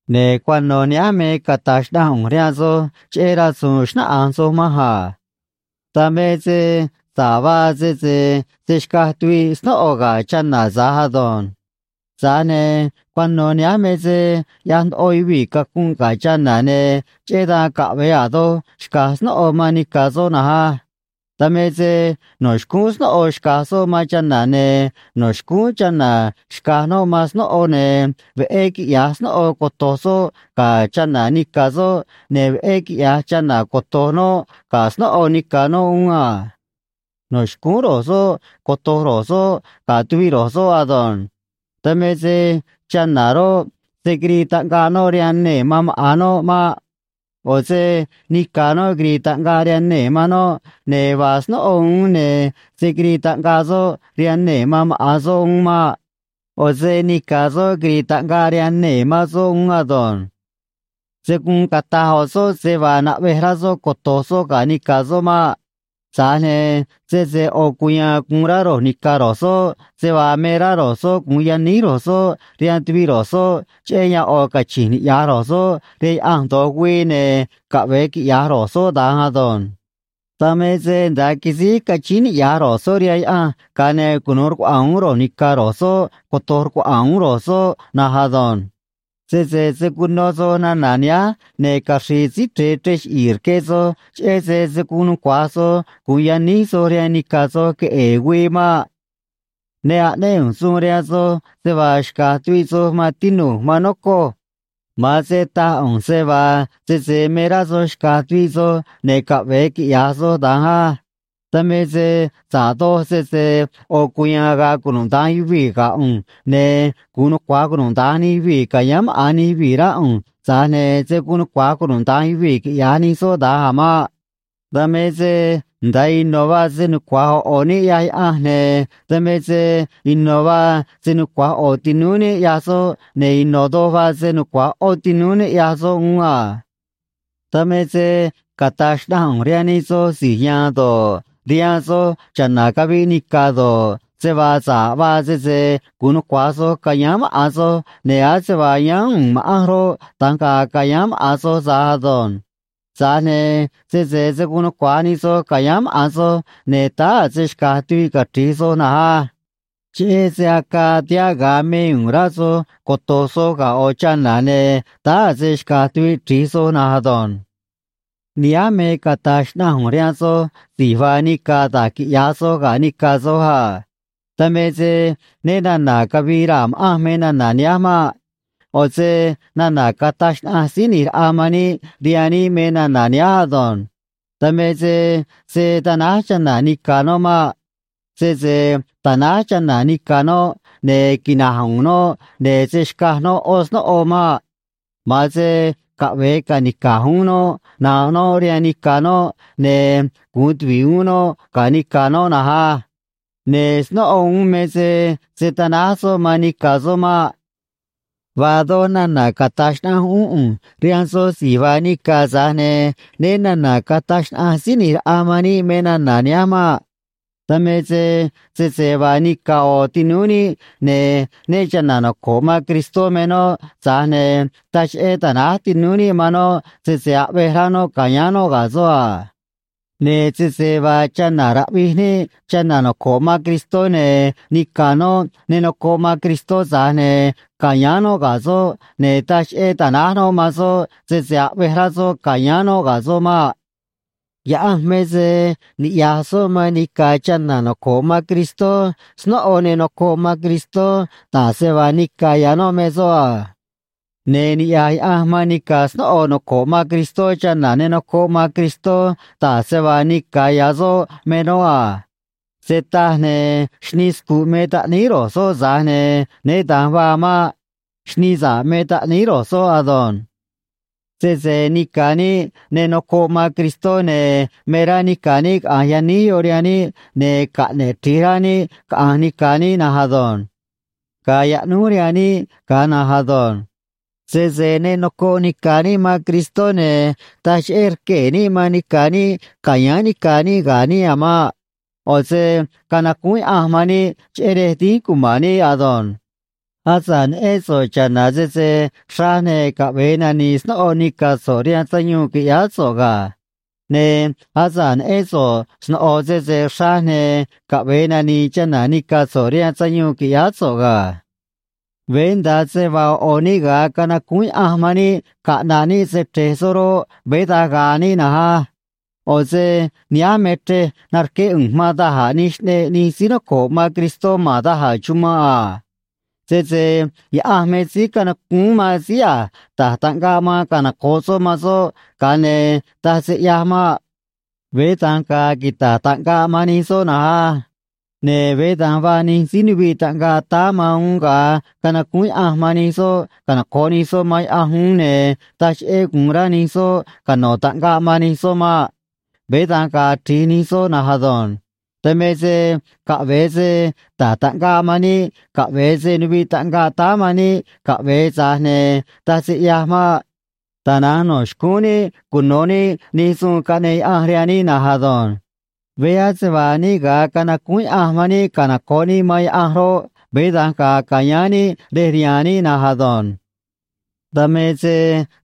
Ne̱ cuano̱ nihánj me cata̱j xnaꞌanj ꞌu̱nj rihaan soj cheꞌé rasu̱u̱n xnáꞌanj soj manj a. Dan me se sa̱ꞌ vaa sese se̱ xcaj tuviꞌ snóꞌo ga̱ chana̱ tza̱j ado̱nj. Tza̱j ne̱ cuano̱ nihánj me se ꞌyaj ndoꞌo yuvii̱ cacunꞌ ga̱ chana̱, ne̱ cheꞌé dan caꞌve̱e a̱ doj xca̱j snóꞌo man nica̱ soꞌ na̱nj á. Dan me se no̱ xcúún snóꞌo xca̱j soꞌ man chana̱, ne̱ no̱ xcúún chana̱ xca̱j noꞌ man snóꞌo, ne̱ veꞌé quiꞌya̱j snóꞌo coto̱j soꞌ ga̱ chana̱ nica̱ soꞌ, ne̱ veꞌé quiꞌya̱j chana̱ coto̱j noꞌ ga̱ snóꞌo nica̱ noꞌ uún a. No̱ xcúún ro̱j soꞌ coto̱j ro̱j soꞌ ga̱ tuviꞌ ro̱j soꞌ ado̱nj. Dan me se chana̱ roꞌ, se̱ quirii taꞌngaꞌ noꞌ rihaan nee̱ man maꞌa̱n noꞌ maꞌ. ꞌO̱ se nica̱ noꞌ quiri̱i̱ taꞌngaꞌ rihaan nee̱ man noꞌ, ne̱ vaa snóꞌo uún, ne̱ se̱ quirii taꞌngaꞌ soꞌ rihaan nee̱ man maꞌa̱n soꞌ uún maꞌ. ꞌO̱ se nica̱ soꞌ quiri̱i̱ taꞌngaꞌ rihaan nee̱ man soꞌ uún ado̱nj. Se̱ guun cata̱j ꞌo̱ soꞌ se vaa naꞌvej rá soꞌ coto̱j soꞌ ga̱ nica̱ soꞌ maꞌ. Tza̱j ne̱ sese ꞌo̱ cuya̱a̱n gu̱un rá ro̱j ni̱ca̱ ro̱j soꞌ se vaa me rá ro̱j soꞌ gu̱un yaníj ro̱j soꞌ rihaan tuviꞌ ro̱j soꞌ cheꞌé yan ꞌo̱ cachi̱nj niꞌya̱j ro̱j soꞌ rihaan Yaꞌanj do̱j güii, ne̱ caꞌve̱e quiꞌya̱j ro̱j soꞌ da̱nj ado̱nj. Dan me se nda̱a quisíj cachíín niꞌya̱j ro̱j soꞌ rihaan Yaꞌanj, ga̱a ne̱ cunu̱u rcuaꞌa̱a̱n uún ro̱j ni̱ca̱ ro̱j soꞌ, coto̱j rcuaꞌa̱a̱n uún ro̱j soꞌ na̱nj ado̱nj. Sese se̱ cuno soj nana̱ nihánj, ne̱ caxri̱i̱ Síí Chre̱e chrej chiꞌi̱i̱ rque soj, cheꞌé se se̱ guun nucua̱j soj gu̱un yaníj soj rihaan nica̱ soj queꞌe̱e̱ güii maꞌ. Ne aꞌnéꞌ ꞌu̱nj suun rihaan soj se vaa xca̱j tuviꞌ soj, maan tinu̱j, maan nocoj. Ma̱an se taj ꞌu̱nj se vaa sese me rá soj xca̱j tuviꞌ soj, ne̱ caꞌve̱e quiꞌya̱j soj da̱nj á. Dan me se sa̱ꞌ doj sese ꞌo̱ cuya̱a̱n ga̱a̱ cunuda̱nj yuvii̱ ga̱ ꞌu̱nj, ne̱ gu̱un nucua̱j cunuda̱nj nij yuvii̱ ca̱yáán maꞌa̱n nij yuvii̱, rá ꞌu̱nj, tza̱j ne̱ se̱ guun nucua̱j cunuda̱nj yuvii̱ quiꞌya̱j nij soꞌ da̱nj a̱ maꞌ. Dan me se nda̱a ino̱ vaa se nucua̱j ꞌo̱ ꞌo̱ níꞌ, ꞌyaj Yaꞌanj, ne̱ dan me se ino̱ vaa se nucua̱j ꞌo̱ tinúú níꞌ ꞌyaj soꞌ, ne̱ ino̱ doj vaa se nucua̱j ꞌó tinúú níꞌ ꞌyaj soꞌ uún a. Dan me se cata̱j xnaꞌanj ꞌu̱nj rihaan nij soj si̱j ya̱a̱n do̱ꞌ, rihaan soj cha̱na̱ caviꞌ nica̱ do̱ꞌ, se vaa sa̱ꞌ vaa sese gu̱un nucua̱j soj ca̱yáán maꞌa̱n soj, ne̱ ase vaa yáán u̱u̱n ma̱ꞌanj roꞌ, da̱nj ga̱a̱ ca̱yáán maꞌa̱n soj tza̱j ado̱nj. Tza̱j ne̱ sese se̱ guun nucua̱j nij soj ca̱yáán maꞌa̱n soj, ne̱ táá a̱ se xca̱j tuviꞌ cachri̱j soj na̱nj á. Cheꞌé se acaa tihaꞌ ga̱a me u̱u̱n rá soj coto̱j soj ga̱ ꞌo̱ chana̱, ne̱ táá a̱ se xca̱j tuviꞌ chri̱j soj na̱nj ado̱nj. Nihánj me cata̱j xnaꞌanj ꞌu̱nj rihaan soj si̱j vaa nica̱ da̱j quiꞌya̱j soj ga̱ nica̱ soj a. Dan me se né na̱na̱ cavii raa̱ ma̱ꞌanj me nana̱ nihánj maꞌ. ꞌO̱ se nana̱ cataj xnaꞌanj Síí ꞌNi̱j Raꞌa man níꞌ rihaan níꞌ me nana̱ nihánj ado̱nj. Dan me se se̱ tanáj chana̱ nica̱ noꞌ maꞌ. Sese tanáj chana̱ nica̱ noꞌ, ne̱ quina̱j u̱u̱n noꞌ, ne̱ se̱ xcaj noꞌ ꞌó snóꞌo maꞌ. Ma̱an se caꞌve̱e ca̱nica̱j uún noꞌ nanꞌ noꞌ rihaan nica̱ noꞌ, ne̱ gu̱un tuvi̱ꞌ uún noꞌ ga̱ nica̱ noꞌ na̱nj á. Ne̱ snóꞌo uún me se se̱ tanáj soꞌ man nica̱ soꞌ maꞌ. Vaa doj nana̱ cata̱j xnaꞌanj uún ꞌu̱nj rihaan soj si̱j vaa nica̱, tza̱j ne̱ né na̱na̱ cataj xnaꞌanj Síí ꞌNi̱j Raꞌa man níꞌ me nana̱ nihánj maꞌ. Dan me se sese vaa nica̱ ꞌo̱ tinúú níꞌ, ne̱ né cha̱na̱ noco̱ꞌ man Cristó me noꞌ, tza̱j ne̱ taj cheꞌé ta̱náj tinúú níꞌ man noꞌ, sese aꞌvej rá noꞌ ca̱yáán noꞌ ga̱ soꞌ a. Ne̱ sese vaa chana̱ raꞌvij níꞌ chana̱ noco̱ꞌ man Cristó, ne̱ nica̱ noꞌ ne nocoꞌ man Cristó, tza̱j ne̱ ca̱yáán noꞌ ga̱ soꞌ, ne̱ taj cheꞌé ta̱náj noꞌ man soꞌ, sese aꞌvej rá soꞌ ca̱yáán noꞌ ga̱ soꞌ maꞌ. Yaꞌanj me se niꞌya̱j soꞌ man nica̱ chana̱ noco̱ꞌ man Cristó, snóꞌo ne nocoꞌ man Cristó, da̱j se vaa nica̱ ya̱ noꞌ me soꞌ a. Ne̱ niꞌya̱j Yaꞌanj man nica̱ snóꞌo noco̱ꞌ man Cristó, chana̱ ne nocoꞌ man Cristó, da̱j se vaa nica̱ ya̱ soꞌ me noꞌ a. Se taj, ne̱ xnii scu̱ꞌ me taꞌníí ro̱j soꞌ, tza̱j ne̱ né da̱nj vaa maꞌ. Xnii sa̱ꞌ me taꞌníí ro̱j soꞌ ado̱nj. Sese nica̱ níꞌ ne nocoꞌ man Cristó, ne̱ me rá nica̱ níꞌ caꞌa̱nj yaníj yoꞌ rihaan níꞌ, ne̱ caꞌne̱ꞌ chri̱j rá níꞌ caꞌa̱nj nica̱ níꞌ na̱nj ado̱nj. Ga̱a̱ yaꞌnúj rihaan níꞌ ga̱a na̱nj ado̱nj. Sese ne nocoꞌ nica̱ níꞌ man Cristó, ne̱ taj cheꞌé rquee̱ níꞌ man nica̱ níꞌ ca̱yáán nica̱ níꞌ ga̱ níꞌ a̱ maꞌ. ꞌO̱ se canacúún Yaꞌanj man níꞌ cheꞌé rej dínj cuma̱n níꞌ ado̱nj. Asa̱ꞌ neꞌén so̱ꞌ cha̱na̱ sese xraj, ne̱ caꞌve̱e nani̱i̱ snóꞌo nica̱ so̱ꞌ rihaan sayuun qui̱ꞌyáá so̱ꞌ ga̱. Ne̱ asa̱ꞌ neꞌén so̱ꞌ sno̱ꞌo sese xra̱j, ne̱ caꞌve̱e nani̱i̱ chana̱ nica̱ so̱ꞌ rihaan sayuun qui̱ꞌyáá so̱ꞌ ga̱. Veé nda̱a se vaa ꞌo̱ ꞌo̱ níꞌ ga̱a canacúún Yaꞌanj man níꞌ caꞌna̱ꞌ níꞌ se‑chre̱j soꞌ roꞌ, veé da̱nj ga̱a̱ níꞌ na̱nj á. ꞌO̱ se nihánj me chrej narqué ꞌu̱nj man da̱j a̱ nij xꞌneꞌ nij síí noco̱ꞌ man Cristó ma̱n da̱j a̱ chumanꞌ a. Sese Yaꞌanj me síí canacúún man síí a̱j ta̱j taꞌngaꞌ man canoco̱ꞌ soꞌ man soꞌ, ga̱a ne̱ taj se ꞌyaj maꞌ. Veé da̱nj ga̱a̱ quita̱j taꞌngaꞌ man nij soꞌ na̱nj á. Ne̱ veé da̱nj vaa nij síí nuviꞌ taꞌngaꞌ táá man uún ga̱a canacúún Yaꞌanj man nij soꞌ canoco̱ꞌ nij soꞌ man Yaꞌanj uún, ne̱ taj cheꞌé gu̱un rá nij soꞌ cano̱ taꞌngaꞌ man nij soꞌ maꞌ. Veé da̱nj ga̱a̱ chri̱j nij soꞌ na̱nj ado̱nj. Dan me se caꞌve̱e se ta̱j taꞌngaꞌ man níꞌ, caꞌve̱e se nuviꞌ taꞌngaꞌ táá man níꞌ, caꞌve̱e, tza̱j ne̱ taj se ꞌyaj maꞌ. Tana̱nj no̱ xcúún níꞌ cuno̱ níꞌ nij suun caꞌneꞌ Yaꞌanj rihaan níꞌ na̱nj ado̱nj. Veé ase vaa níꞌ ga̱a canacúún Yaꞌanj man níꞌ canoco̱ꞌ níꞌ man Yaꞌanj roꞌ, veé da̱nj ga̱a̱ ca̱yáán níꞌ rej rihaan níꞌ na̱nj ado̱nj. Dan me se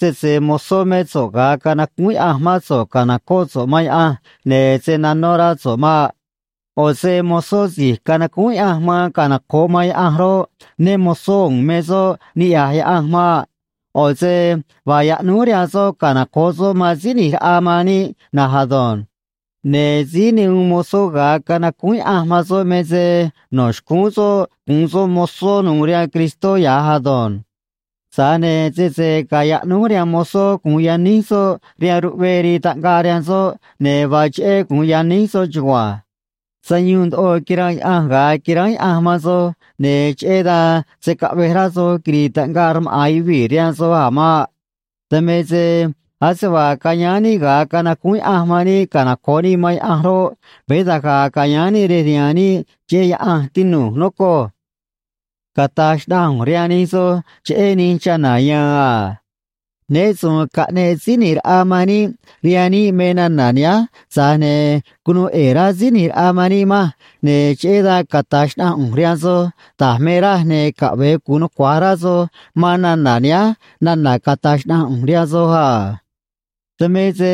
sese mozó mé so̱ꞌ ga̱a canacúún Yaꞌanj mán so̱ꞌ ca̱nocóꞌ so̱ꞌ man Yaꞌanj, ne̱ se̱ nanó rá so̱ꞌ maꞌ. ꞌO̱ se mozó si̱j canacúún Yaꞌanj man canoco̱ꞌ man Yaꞌanj roꞌ, né mo̱zó u̱u̱n me soꞌ, niꞌya̱j Yaꞌanj maꞌ. ꞌO̱ se vaa yaꞌnúj rihaan soꞌ canoco̱ꞌ soꞌ man Síí ꞌNi̱j Raꞌa man níꞌ na̱nj ado̱nj. Ne̱ síí ne uun mozó ga̱a canacúún Yaꞌanj man soꞌ me se no̱ xcúún soꞌ gu̱un soꞌ mozó nu̱u̱ rihaan Cristó ya̱j ado̱nj. Tza̱j ne̱ sese ga̱a̱ yaꞌnúj rihaan mozó gu̱un yaníj soꞌ rihaan ruꞌvee rii taꞌngaꞌ rihaan soꞌ, ne̱ vaa cheꞌé gu̱un yaníj soꞌ chugua̱nj. Sayuun ndoꞌo quiranꞌ Yaꞌanj ga̱a quiránj Yaꞌanj man soj, ne̱ cheꞌé dan se̱ caꞌvej rá soj quiri̱i̱ taꞌngaꞌ rmaꞌa̱n yuvii̱ rihaan soj a̱ maꞌ. Dan me se ase vaa cayáán níꞌ ga̱a canacúún Yaꞌanj man níꞌ canoco̱ꞌ níꞌ man Yaꞌanj roꞌ, veé da̱nj ga̱a̱ ca̱yáán níꞌ rej rihaan níꞌ cheꞌé Yaꞌanj, tinu̱j, nocoj. Cata̱j xnaꞌanj ꞌu̱nj rihaan nij soj cheꞌé nij chana̱ ya̱a̱n a. Né su̱u̱n caꞌneꞌ Síí ꞌNi̱j Raꞌa man níꞌ rihaan níꞌ me nana̱ nihánj, tza̱j ne̱ cunuu ꞌe̱e̱ rá Síí ꞌNi̱j Raꞌa man níꞌ manj, ne̱ cheꞌé dan cata̱j xnaꞌanj ꞌu̱nj rihaan soj da̱j me raj, ne̱ caꞌve̱e gu̱un nucua̱j rá soj man nana̱ nihánj nana̱ cata̱j xnaꞌanj ꞌu̱nj rihaan soj a. Dan me se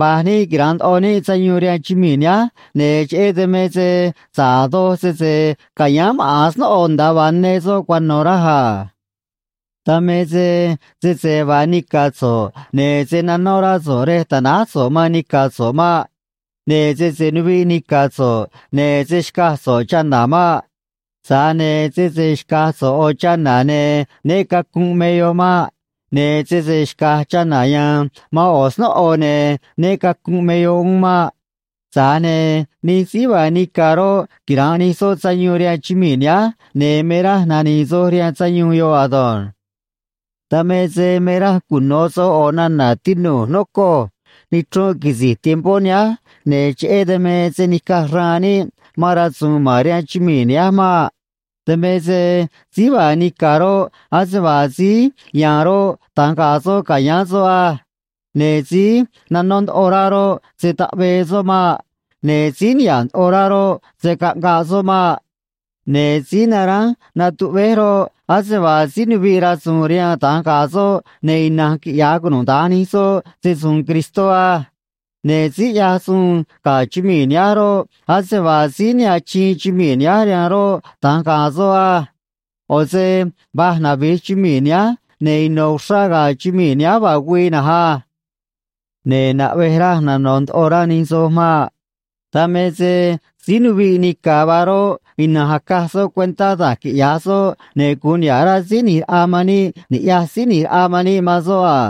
va̱j níꞌ quira̱nꞌ ndoꞌo níꞌ sayuun rihaan chumii̱ nihánj, ne̱ cheꞌé dan me sa̱ꞌ a̱ doj sese ca̱yáán maꞌa̱n snóꞌo nda̱a vaa ne soꞌ cuano̱, raj a. Dan me se sese vaa nica̱ so̱ꞌ, ne̱ se̱ nanó rá so̱ꞌ rej ta̱náj so̱ꞌ man nica̱ so̱ꞌ maꞌ. Ne̱ sese nuviꞌ nica̱ so̱ꞌ, ne̱ se̱ xcaj so̱ꞌ chana̱ maꞌ. Tza̱j ne̱ sese xca̱j so̱ꞌ ꞌo̱ chana̱, ne̱ né cacu̱nꞌ me yoꞌ maꞌ. Ne̱ sese xca̱j chana̱ ya̱a̱n man ꞌo̱ snóꞌo, ne̱ né cacu̱nꞌ me yoꞌ uún maꞌ. Tza̱j ne̱ nij síí vaa nica̱ roꞌ, quira̱nꞌ nij soꞌ sayuun rihaan chumii̱ nihánj, ne̱ me raj nani̱i̱ soj rihaan sayuun yoꞌ ado̱nj. Dan me se me raj cuno̱ soj ꞌo̱ nana̱, tinu̱j, nocoj: Nichrunꞌ quisi̱j tiempó nihánj, ne̱ cheꞌé dan me se̱ nica̱j xraan níꞌ man rasu̱u̱n ma̱n rihaan chumii̱ nihánj maꞌ. Dan me se síí vaa nica̱ roꞌ, ase vaa síí ya̱a̱n roꞌ, da̱nj ga̱a̱ soꞌ ca̱yáán soꞌ á. Ne̱ síí nanó ndoꞌo rá roꞌ, se̱ taꞌvee soꞌ maꞌ. Ne̱ síí niha̱ꞌ ndoꞌo rá roꞌ, se̱ caꞌngaꞌ soꞌ maꞌ. Ne̱ síí naránj natuꞌvéj roꞌ, ase vaa síí nuviꞌ rasu̱u̱n rihaan da̱nj ga̱a̱ soꞌ, ne̱ ina̱nj quiꞌya̱j cunuda̱nj nij soꞌ se‑su̱u̱n Cristó á. Ne̱ síí ꞌyaj suun ga̱ chumii̱ nihánj roꞌ, ase vaa síí ne achiin chumii̱ nihánj rihaan roꞌ, da̱nj ga̱a̱ soꞌ á. ꞌO̱ se va̱j navi̱j chumii̱ nihánj, ne̱ ino̱ uxrá ga̱a̱ chumii̱ nihánj vaa güii na̱nj á. Ne̱ naꞌvej raj nano̱ ndoꞌo rá nij soj maꞌ. Dan me se síí nuviꞌ nica̱ vaa roꞌ, ina̱nj acaj soꞌ cuentá da̱j quiꞌya̱j soꞌ, ne̱ gu̱un niha̱ꞌ rá Síí ꞌNi̱j Raꞌa man níꞌ ni̱ꞌyaj Síí ꞌNi̱j Raꞌa man níꞌ man soꞌ a.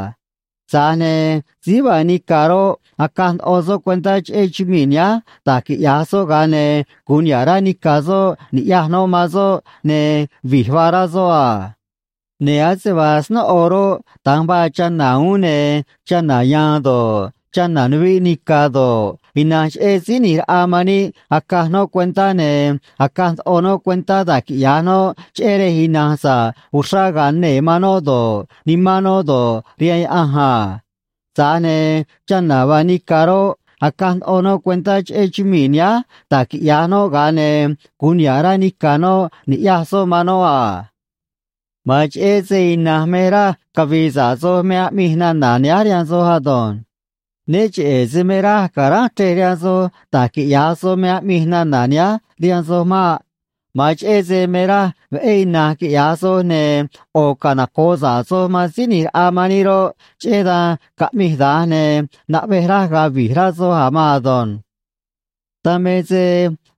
Tza̱j ne̱ síí vaa nica̱ roꞌ, acaj ndoꞌo soꞌ cuentá cheꞌé chumii̱ nihánj da̱j quiꞌya̱j soꞌ, ga̱a ne̱ gu̱un niha̱ꞌ rá nica̱ soꞌ ni̱ꞌyaj noꞌ man soꞌ, ne̱ vi̱j vaa rá soꞌ a. Ne̱ ase vaa snóꞌo roꞌ, da̱nj vaa chana̱ uún, ne̱ chana̱ ya̱a̱n do̱ꞌ, chana̱ nuviꞌ nica̱ do̱ꞌ, ina̱nj cheꞌé Síí ꞌNi̱j Raꞌa man níꞌ acaj noꞌ cuentá, ne̱ acaj ndoꞌo noꞌ cuentá da̱j quiꞌya̱j noꞌ cheꞌé rej ina̱nj sa̱ꞌ uxrá ga̱a̱ nee̱ man noꞌ do̱ꞌ, nimán noꞌ do̱ꞌ, rihaan Yaꞌanj a. Tza̱j ne̱ chana̱ vaa nica̱ roꞌ, acaj ndoꞌo noꞌ cuentá cheꞌé chumii̱ nihánj da̱j quiꞌya̱j noꞌ, ga̱a ne̱ gu̱un niha̱ꞌ rá nica̱ noꞌ ni̱ꞌyaj soꞌ man noꞌ a. Ma̱an cheꞌé se ina̱nj me raj cavi̱i̱ sa̱ꞌ soj me aꞌmij nana̱ nihánj rihaan soj ado̱nj. Né cheꞌe̱ se me raj ca̱ránj chrej rihaan soj da̱j quiꞌya̱j soj me aꞌmij nana̱ nihánj rihaan soj maꞌ. Ma̱an cheꞌé se me raj veꞌé ina̱nj quiꞌya̱j soj ne̱ ꞌo̱ canoco̱ꞌ sa̱ꞌ soj man Síí ꞌNi̱j Raꞌa man níꞌ roꞌ, cheꞌé dan caꞌmij da̱nj, ne̱ naꞌvej raj ga̱a̱ vi̱j rá soj a̱ maan ado̱nj. Dan me se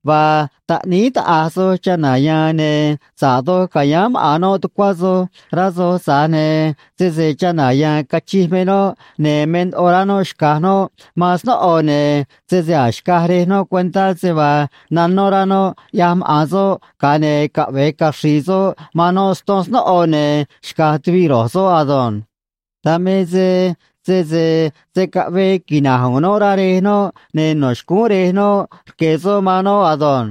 vaa taꞌníí taꞌa̱j soj chana̱ ya̱a̱n, ne̱ sa̱ꞌ doj ca̱yáán maꞌa̱n noꞌ tucuá soj, rá soj, tza̱j ne̱ sese chana̱ ya̱a̱n cachij me noꞌ ne̱ me ndoꞌo rá noꞌ xca̱j noꞌ man snóꞌo, ne̱ sese a̱j xcaj rej noꞌ cuentá se vaa nanó rá noꞌ ꞌyaj maꞌa̱n soꞌ, ga̱a ne̱ caꞌve̱e caxri̱i̱ soꞌ man noꞌ ston snóꞌo, ne̱ xca̱j tuviꞌ ro̱j soꞌ ado̱nj. Dan me se sese se̱ caꞌvee quina̱j u̱u̱n noꞌ, rá rej noꞌ, ne̱ no̱ xcúún rej noꞌ rque̱ soꞌ man noꞌ ado̱nj.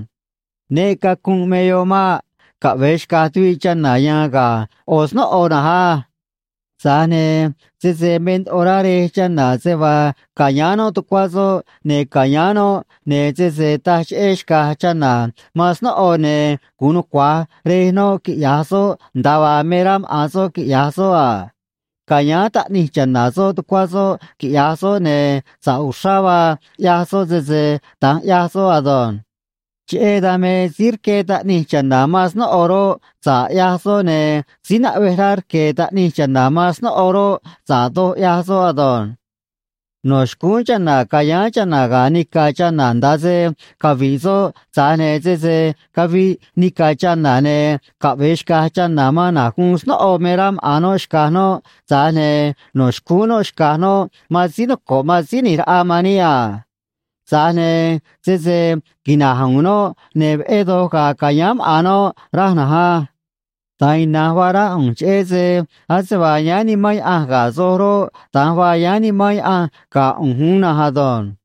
Né cacu̱nꞌ me yoꞌ maꞌ. Caꞌve̱e xca̱j tuviꞌ chana̱ ya̱a̱n ga̱ ꞌo̱ snóꞌo na̱nj á. Tza̱j ne̱ sese me ndoꞌo rá rej chana̱ se vaa ca̱yáán noꞌ tucuá soꞌ, ne̱ ca̱yáán noꞌ, ne̱ sese taj cheꞌé xca̱j chana̱ man snóꞌo, ne̱ gu̱un nucua̱j rej noꞌ quiꞌya̱j soꞌ nda̱a vaa me rá maꞌa̱n soꞌ quiꞌya̱j soꞌ a. Ca̱yáán taꞌnij cha̱na̱ soꞌ tucuá soꞌ, quiꞌya̱j soꞌ, ne̱ sa̱ꞌ uxrá vaa ꞌyaj soꞌ sese da̱nj ꞌyaj soꞌ ado̱nj. Cheꞌé dan me, síí rqué taꞌnij cha̱na̱ man snóꞌo roꞌ, sa̱ꞌ ꞌyaj soꞌ, ne̱ síí naꞌvej rá rque̱ taꞌnij cha̱na̱ man snóꞌo roꞌ, sa̱ꞌ doj ꞌyaj soꞌ ado̱nj. No̱ xcúún chana̱ ca̱yáán chana̱ ga̱ nica̱ chana̱ nda̱a se cavi̱ꞌ soꞌ, tza̱j ne̱ sese caviꞌ nica̱ chana̱, ne̱ caꞌve̱e xca̱j chana̱ man na̱j guun snóꞌo me rá maꞌa̱n noꞌ xca̱j noꞌ, tza̱j ne̱ no̱ xcúún noꞌ xca̱j noꞌ man síí noco̱ꞌ man Síí ꞌNi̱j Raꞌa man níꞌ a. Tza̱j ne̱ sese quina̱j u̱u̱n noꞌ, ne̱ veꞌé doj ga̱a̱ ca̱yáán maꞌa̱n noꞌ raj na̱nj á. Da̱nj ina̱nj vaa rá ꞌu̱nj, cheꞌé se ase vaa yáán Nimán Yaꞌanj ga̱ soj roꞌ, da̱nj vaa yáán Nimán Yaꞌanj ga̱ ꞌu̱nj uún na̱nj ado̱nj.